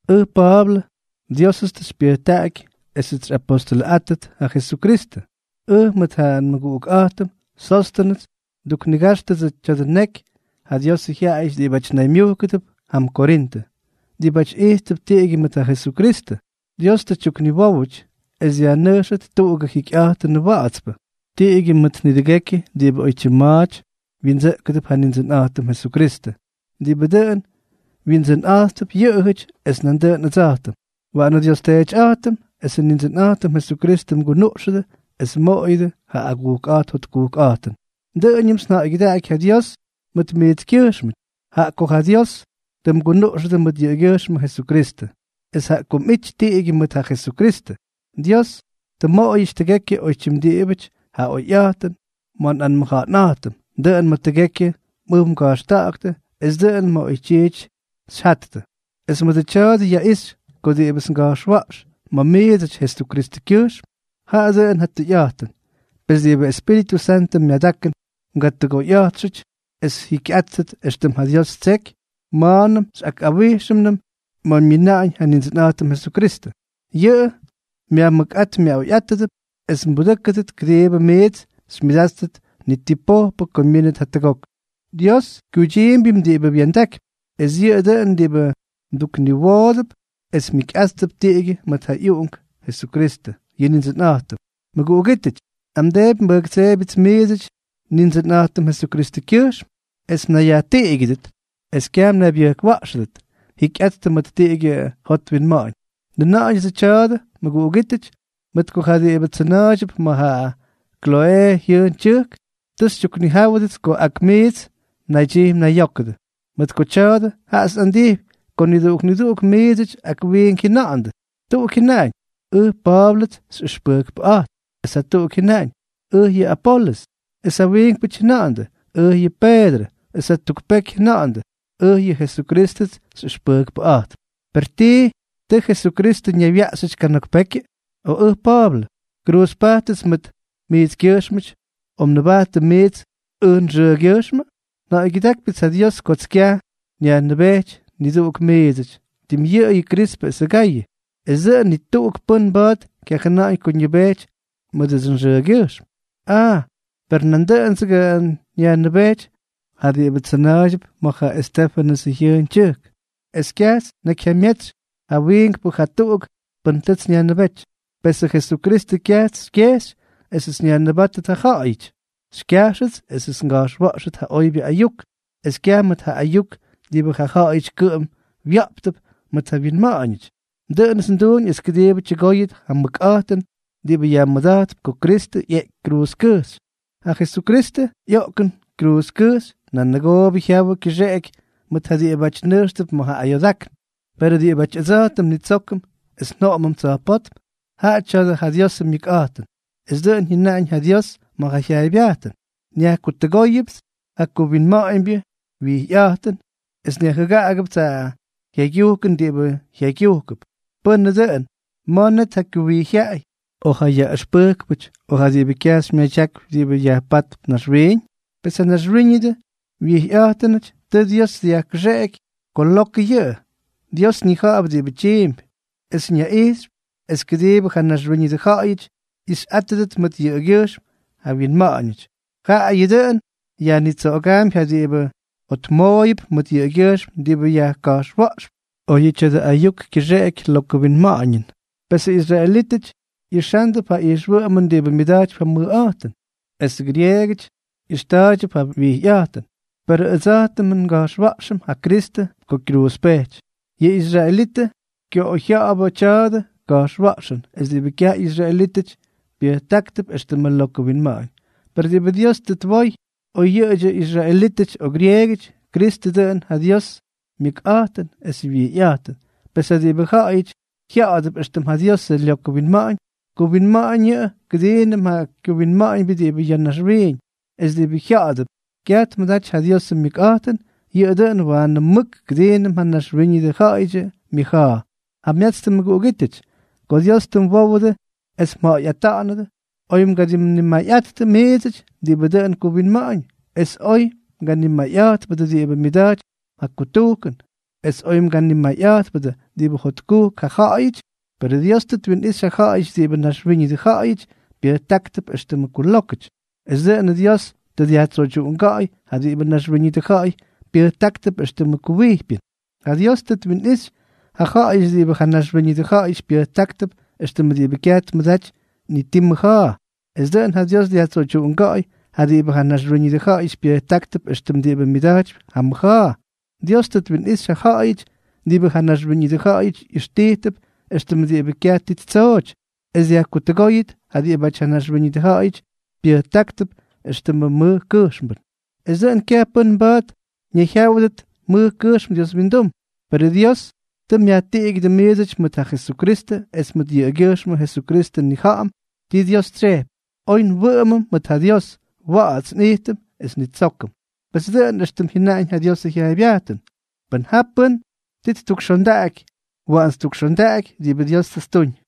Ʉj Pa̱a̱blʉ. Diósʉts tʉ xypyʉjtaꞌaky esʉts xyꞌapostʉlʉꞌátʉt ja Jesukristʉ. Ʉj mʉt ja nmʉguꞌukꞌa̱jtʉm Sóstʉnʉs nduknigajxtʉdsʉ tya̱dʉ neky ja Diosʉ jyaꞌayʉty diꞌibáty naymyujkʉdʉp jam Korintʉ, diꞌibáty ijtp tiꞌigyʉ mʉt ja Jesukristʉ. Dios tʉ tyukniwówʉty es dyajnʉjxʉt tuꞌugʉ jikyꞌa̱jtʉnʉ wa̱ꞌa̱tspʉ, tiꞌigyʉ mʉt nidʉgekyʉ diꞌibʉ oytyim ma̱a̱ty wyindsʉꞌkʉdʉp ja Nindsʉnꞌa̱jtʉm Jesukristʉ, diꞌibʉ dʉꞌʉn Wyindsʉnꞌa̱jttʉp yʉꞌʉjʉty es nandʉꞌʉn ʉdsa̱jtʉm. Waꞌanʉ nDios Teetyꞌa̱jtʉm esʉ Nindsʉnꞌa̱jtʉm Jesukristʉ mgunuꞌxʉdʉ es mmoꞌoyʉdʉ ja agujkꞌa̱jt jotkujkꞌa̱jtʉn. Dʉꞌʉñʉmts nja̱ꞌa̱ygyʉdaꞌaky ja Dios mʉt miitskyʉjxmʉty, jaꞌa ko ja Dios tʉ mgunuꞌxʉdʉ mʉt yʉꞌʉgyʉjxmʉ Jesukristʉ. Es jaꞌa ko mꞌity tiꞌigyʉ mʉt ja Jesukristʉ, Dios tʉ mmoꞌoyʉty tʉgekyʉ oytyim diꞌibʉty ja oyꞌa̱jtʉn ma̱ mꞌanmʉja̱ꞌa̱n, dʉꞌʉn ma̱ tʉgekyʉ mꞌʉw mga̱jxtʉ es dʉꞌʉn ma̱ oytyiity xyjattʉ, es mʉdʉ tya̱a̱dʉ yaꞌixy ko diꞌibʉts nga̱jxwa̱ꞌx ma̱ miidsʉty Jesukristʉkyʉjxm, jaꞌa dʉꞌʉn ja tʉyꞌa̱jtʉn. Pes ni diꞌibʉ Espíritʉ Santʉ myadakʉn mgatʉgoyꞌa̱jtxʉty es mjikyꞌátʉt éxtʉm ja Dios ttseky ma̱a̱nʉm xyꞌakꞌawíxyñʉm ma̱ myina̱ꞌa̱ñ yʉ Nindsʉnꞌa̱jtʉm Jesukristʉ. Yʉꞌʉ myajmʉkꞌát myaꞌoyꞌátʉdʉp es mbudʉ́kʉdʉp kʉdiibʉ miits xymyʉdáttʉt ni ti pojpʉ ko myínʉt jatʉgok. Dios kyuydyiimbyʉm diꞌibʉ wya̱ndakypy, es yʉꞌʉ dʉꞌʉn diꞌibʉ mdukniwoodʉp es mjikyꞌáttʉt tiꞌigyʉ mʉt ja ꞌyUꞌunk Jesukristʉ, yʉ Nindsʉnꞌa̱jtʉm. Mʉguꞌugítʉty, nꞌamdeepy nbʉjktseebyʉts miidsʉty Nindsʉnꞌa̱jtʉm Jesukristʉkyʉjxm, es mnayyajtiꞌigyʉdʉt es kyaj mnaybyʉjkwa̱ꞌxʉdʉt. Jikyꞌattʉ mʉt tiꞌigyʉ jot winma̱ꞌa̱ñ. Njʉna̱ꞌa̱ñʉdsʉ tya̱a̱dʉ, mʉguꞌugítʉty, mʉt ko ja diꞌibʉ tsʉna̱a̱ydyʉp ma̱ ja Kloꞌee jyʉʉn tyʉjk tʉ xytyuknijáwʉts ko ak miits mnaydyij mnayyókʉdʉ. Mʉdʉ tya̱a̱dʉ, jaꞌats nꞌandijpy ko niduꞌuk niduꞌuk miidsʉty ak wiink jyʉna̱ꞌa̱ndʉ. Tuꞌuk jyʉnaꞌañ: “Ʉj, Pa̱a̱blʉts xyꞌʉxpʉjkpʉꞌa̱jtp” es jatuꞌuk jyʉnaꞌañ: “Ʉj yʉꞌʉ Apolʉs” es ja wiinkpʉty jyʉna̱ꞌa̱ndʉ: “Ʉj yʉꞌʉ Peedrʉ” es jatuk peky jyʉna̱ꞌa̱ndʉ: “Ʉj yʉꞌʉ Jesukrístʉts xyꞌʉxpʉjkpʉꞌa̱jtp.” ¿Per tii, tʉʉ ja Jesukristʉ ñaywyaꞌxyʉty kana̱k pekyʉ?, o ʉj Pa̱a̱blʉ, ¿kruuzpajtʉts mʉt miitskyʉjxmʉty, o mnʉbajttʉ miits ʉj nxʉʉgyʉjxmʉ? Nja̱ꞌa̱ygyʉdákypyʉts ja Dios kots kyaj nyajnʉbejty niduꞌuk miidsʉty, tim yʉꞌʉyʉ Krispʉ esʉ Gayʉ. Es dʉꞌʉn ni tuꞌuk pʉ́n mba̱a̱t kyajʉna̱ꞌa̱ñ ko ñʉbejty mʉdʉdsʉ nxʉʉgyʉjxm. Aa, per nandʉꞌʉndsʉga nyajnʉbejty ja diꞌibʉ tsʉna̱a̱ydyʉp ma̱ ja Estéfʉnʉsʉ jyʉʉn tyʉjk, es kyajts nnakyjyamyetsy ja wiinkpʉ jatuꞌuk pʉ́n tʉts nyajnʉbéty. Pesʉ Jesukristʉ kyajts xykyejxy esʉts nyajnʉbátʉt ja ja̱ꞌa̱yʉty, xykyajxʉts esʉts nga̱jxwa̱ꞌxʉt ja oybyʉ ayuk, es kyaj mʉt ja ayuk diꞌibʉ ja ja̱ꞌa̱yʉty kʉꞌʉm wya̱ꞌptʉp mʉt ja wyinma̱ꞌa̱ñʉty. Dʉꞌʉnʉts nduñ es kʉdiibʉ tyʉgóyʉt ja mʉkꞌa̱jtʉn diꞌibʉ yajmʉda̱jtp ko Kristʉ ꞌyeꞌky kruuzkʉjxy. Ja Jesukristʉ ꞌyoꞌkʉn kruuzkʉjxy nanʉgoobʉ jyawʉ kyʉxeꞌeky mʉt ja diꞌibáty nʉjxtʉp ma̱ ja ayoodákn, perʉ diꞌibáty ʉdsa̱jtʉm nnitsókʉm es njoꞌomʉm tsa̱jpótm, jaꞌa tya̱a̱dʉ ja Diosʉ myʉkꞌa̱jtʉn. Es dʉꞌʉn jyʉnaꞌañ ja Dios ma̱ ja jyaaybyajtʉn: Nyajkutʉgóyʉpts ja kuwinma̱ꞌa̱ñbyʉ wyijyꞌa̱jtʉn, es nyajjʉgákʉpts ja jyaygyujkʉn diꞌibʉ jaygyujkʉp. Pʉnʉ dʉꞌʉn, ¿ma̱ net ja kuwijyjyaꞌay, o ja yaꞌʉxpʉjkpʉty, o ja diꞌibʉ kyajxy myadyakypy diꞌibʉ yajpátp naxwiiñ? Pes ja naxwíñʉdʉ wijyꞌa̱jtʉnʉty, tʉ Dios dyajkʉxeꞌeky ko lokʉ yʉꞌʉ. Dios ñija̱ꞌa̱p diꞌibʉ tyiimpy, es ñaꞌijxypy es kʉdiibʉ ja naxwíñʉdʉ ja̱ꞌa̱yʉty ꞌyixyꞌátʉdʉt mʉt yʉꞌʉgyʉjxm ja wyinma̱ꞌa̱ñʉty, jaꞌayʉ dʉꞌʉn yajnitsoꞌogaampy ja diꞌibʉ jotmooyʉp mʉt yʉꞌʉgyʉjxm diꞌibʉ yajka̱jxwa̱ꞌxp, oyʉ tya̱dʉ ayuk kyʉxeꞌeky lokʉ winma̱ꞌa̱ñʉn. Pesʉ israelítʉty ꞌyixándʉp ja ijxwʉꞌʉmʉn diꞌibʉ myʉda̱jtypy ja mʉjꞌa̱jtʉn, esʉ grieegʉty ꞌyʉxta̱a̱ydyʉp ja wijyꞌa̱jtʉn, perʉ ʉdsa̱jtʉm nga̱jxwa̱ꞌxʉm ja Kristʉ ko kyruuzpejty. Yʉ israelítʉty kyoꞌoyjya̱ꞌa̱dʉbʉ tya̱dʉ ka̱jxwa̱ꞌxʉn, es diꞌibʉ kyaj ꞌyisraelítʉty pyʉjtáktʉp éxtʉmʉ lokʉ winma̱ꞌa̱ñ, per diꞌibʉ Dios tʉ twoy, oy yʉꞌʉdyʉ israelítʉty o grieegʉty, Kristʉ dʉꞌʉn ja Diosʉ myʉkꞌa̱jtʉn esʉ wyijyꞌa̱jtʉn. Pes ja diꞌibʉ ja̱ꞌa̱yʉty jya̱ꞌa̱dʉp éxtʉm ja Diosʉ lyokʉ winma̱ꞌa̱ñ, kuwinma̱ꞌa̱ñʉꞌʉ kʉdiinʉm ja kuwinma̱ꞌa̱ñbyʉ diꞌibʉ ya̱ naxwiiñ; es diꞌibʉ jya̱ꞌa̱dʉp kyaj tmʉdaty ja Diosʉ myʉkꞌa̱jtʉn, yʉꞌʉ dʉꞌʉn waanʉ mʉk kʉdiinʉm ja naxwíñʉdʉ ja̱ꞌa̱yʉdyʉ myʉja̱a̱. Jamyatstʉ mʉguꞌugítʉty, ko Dios tʉ mwówʉdʉ es mja̱ꞌa̱yꞌata̱ꞌa̱nʉdʉ, oy mganimayꞌa̱jtpʉdʉ miidsʉty diꞌibʉ dʉꞌʉn kuwinma̱ꞌa̱ñ, es oy mganimayꞌa̱jtpʉdʉ diꞌibʉ myʉda̱jtypy ja kutujkʉn, es oy mganimayꞌa̱jtpʉdʉ diꞌibʉ jotkujk ja̱ꞌa̱yʉty. Perʉ Dios tʉ twinꞌixy ja ja̱ꞌa̱yʉty diꞌibʉ naxwíñʉdʉ ja̱ꞌa̱yʉty pyʉjtáktʉp éxtʉmʉ kulókʉty, es dʉꞌʉn Dios dyajtsoydyuꞌunga̱ꞌa̱y ja diꞌibʉ naxwíñʉdʉ ja̱ꞌa̱y pyʉjtáktʉp éxtʉmʉ kuwijpyʉn. Ja Dios tʉ twinꞌixy ja ja̱ꞌa̱yʉty diꞌibʉ ja naxwíñʉdʉ ja̱ꞌa̱yʉty pyʉjtáktʉp éxtʉmʉ diꞌibʉ kyaj tmʉdaty ni ti mʉja̱a̱, es dʉꞌʉn ja Dios dyajtsoydyuꞌunga̱ꞌa̱y ja diꞌibʉ ja naxwíñʉdʉ ja̱ꞌa̱yʉty pyʉjtáktʉp éxtʉmʉ diꞌibʉ myʉda̱jtypy ja mʉja̱a̱. Dios tʉ twinꞌixy ja ja̱ꞌa̱yʉty diꞌibʉ ja naxwíñʉdʉ ja̱ꞌa̱yʉty ꞌyʉxtijtʉp éxtʉm diꞌibʉ kyaj ti ttsooty, es dyajkutʉgóyʉt ja diꞌibáty ja naxwíñʉdʉ ja̱ꞌa̱yʉty pyʉjtáktʉp éxtʉmʉ mʉj kʉjxmbʉn, es dʉꞌʉn kyaj pʉ́n mba̱a̱t ñayjyáwʉdʉt mʉj kʉjxm Dios windum. Perʉ Dios tʉ myajtiꞌigyʉdʉ miidsʉty mʉt ja Jesukristʉ es mʉt yʉꞌʉgyʉjxmʉ Jesukristʉ nnija̱ꞌa̱m ti Dios tsyejpy, oy nwʉꞌʉmʉm mʉt ja Dios, wa̱ꞌa̱ts nꞌijtʉm es nnitsókʉm. Pes dʉꞌʉn éxtʉm jyʉnaꞌañ ja Diosʉ jyaaybyajtʉn: “Pʉn ja pʉ́n ti ttukxondaꞌaky, waꞌan ttukxondaꞌaky diꞌibʉ Dios tʉ ttuñ.”